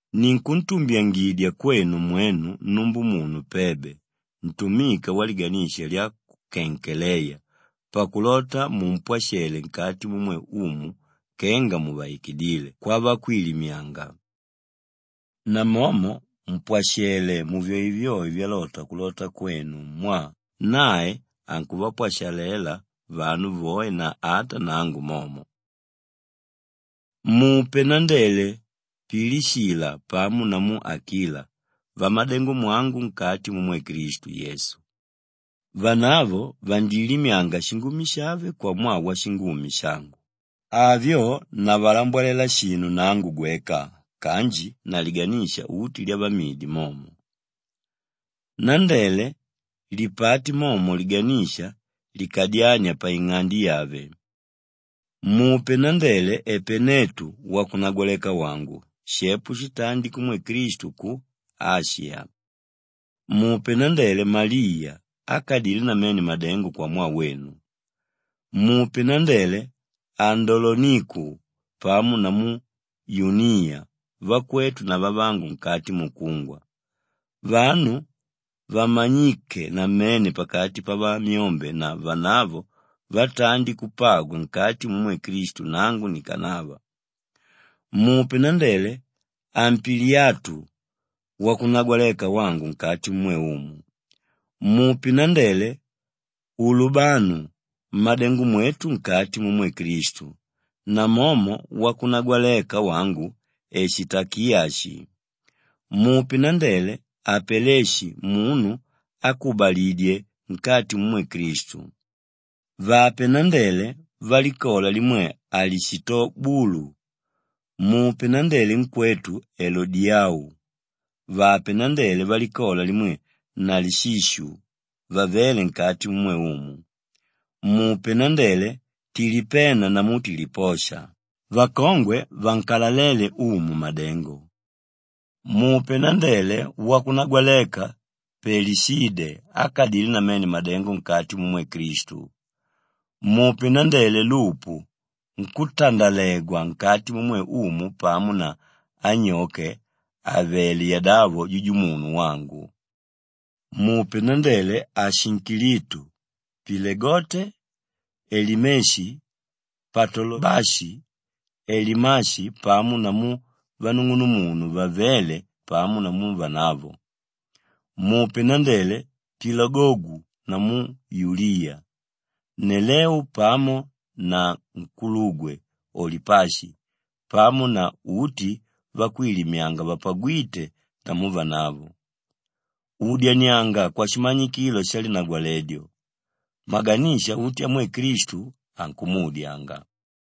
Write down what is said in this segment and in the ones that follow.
Ninkuntumbyangidya kwenu mwenu numbumunu Pebe ntumika waliganisha lya ku Kenkeleya pakulota mumpwashalele nkati mumwe Umu kenga muvaikidíle kwavakwilimyanga, namomo mpwashele muvyoevyoe vyalota kulota kwenu mwaa nae ankuvapwashalela vanu voe na ata nangu momo. Mupe nandele Pilishila pamo namu Akila vamadengomwangu nkati mumwe Klistu Yesu. Vanavo vandilimyanga shingumi shave kwamwaa washingumi shangu; avyo navalambwalela shinu nangu gweka kanji na liganisha uti lyavamidi momo. Nandele lipate momo liganisha likadyánia paing'ande yave. Mupe nandele Epenetu wakunagwaleka wangu shepo shitandi kumwe Klistu ku Ashiya. Mupe nandele Maliya ákadile namene madengo kwamwaa wenu. Mupe nandele Andoloniku pamo namu Yuniya vakwetu na vavangu nkati mukungwa, vanu vamanyíke namene pakati pavamyombe na vanavo vatandi kupagwa nkati mumwe Klistu nangu nikanava. Mupe nandele Ampiliyatu wakunagwaleka wangu nkati mumwe Umu. Mupe nandele Ulubanu mmádengomwetu nkati mumwe Klistu, namomo wakunagwaleka wangu Eshitakiyashi. Mupe nandele Apeleshi munu ákubaligwidye nkati mumwe Klistu. Vape nandele valikola limwe Alishitobulu. Mupe nandele nkwetu Elodiyau. Vape nandele valikola limwe Nalishishu vavéle nkati mumwe Umu. Mupe nandele Tilipena namu Tiliposha vakongwe vankaléla Umu madengo. Mupe nandele wakunagwaleka Pelishide ákadile namene madengo nkati mumwe Klistu. Mupe nandele Lupu nkútandalegwa nkati mumwe Umu pamo na anyoke àvele yadavo jujumunu wangu. Mupe nandele Ashinkilitu, Pilegonte, Elimeshi, Patolobashi, Elimashi pamo namu vanung'unumunu vavéle pamo namu vanavo. Mupe nandele Pilologu namu Yuliya, Neleu pamo na nkulugwe, Olipashi pamo na uti vakwilimyanga vapagwíte namu vanavo. Udyanianga kwashimanyikilo shalinagwaledyo. Maganisha uti amwe Klistu ankumuudyanga.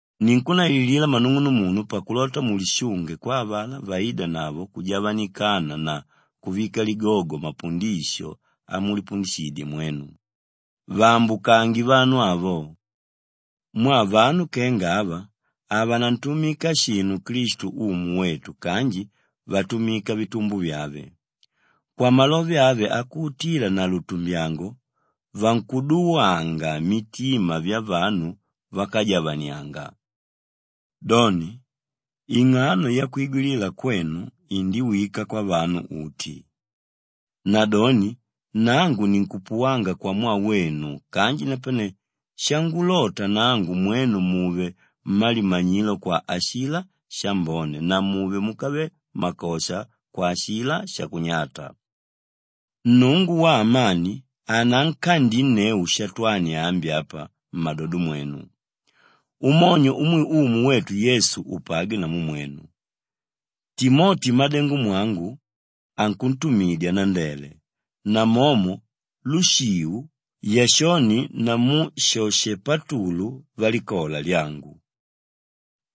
Ninkunnaililila mmanung'unumunu pakulota mulishunge kwa avalá váidanavo kujavanikana na kuvika ligogo mapundisho amulipundishidye mwenu. Vaambukange vanu avo! Mwaa vanu kenga ava havanantumika shinu Klistu Umu wetu kanji vatumika vitumbo vyave. Kwamalove ave akuutila na lutumbyango, vankuduwanga mitima vyavanu vákajavanianga. Doni, ing'ano yakwigwilila kwenu indiwika kwavanu uti, nadoni nangu ninkupuwanga kwamwaa wenu kanji napane shangulota nangu mwenu muve mmalimanyilo kwa ashilá shambone na muve múkave makosha kwa ashilá shakunyata. Nnungu waamani anankandinneu Shatwani ambi apa mmadodo mwenu. Umonyo umwe Umu wetu Yesu upagwe namu mwenu. Timoti mmádengomwangu ankuntumidya nandele, namomo Lushiu, Yashoni namu Shoshipatulu valikola lyangu.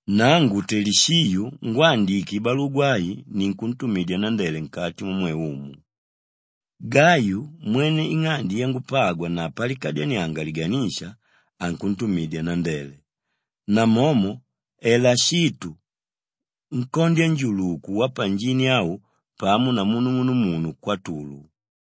Nangu Telishiu ngwándike ibalugwa ai ninkuntumidya nandele nkati mumwe Umu. Gayu mwene ing'ande yangupagwa na palikadyanianga liganisha, ankuntumidya nandele, namomo Elashitu nkondya-njuluku wapanjini au pamo namu nung'unumunu Kwatulu.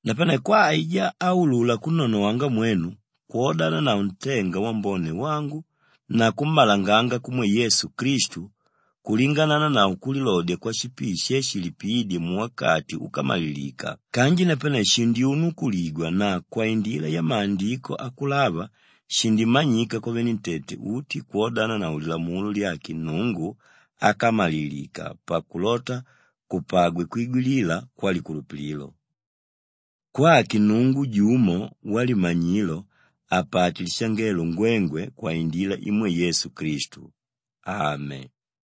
Napane kwa aijá áulula kunnonowanga mwenu kwodananavo ntenga wambone wangu na kummalanganga kumwe Yesu Klistu kulingananavo kulilodya kwashipii she shilipiídye muwakati úkamalilika kanji napane, shindyunukuligwa na kwaindila yamaandiko akulava shindimanyika kwavenentete uti kwodananavo lilamulo lyake Nnungu ákamalilika pakulota kupagwe kwigwilila kwalikulupililo; kwake Nnungu jumo walimanyilo apate lishangelo ngwengwe kwaindila imwe Yesu Klistu. Ame.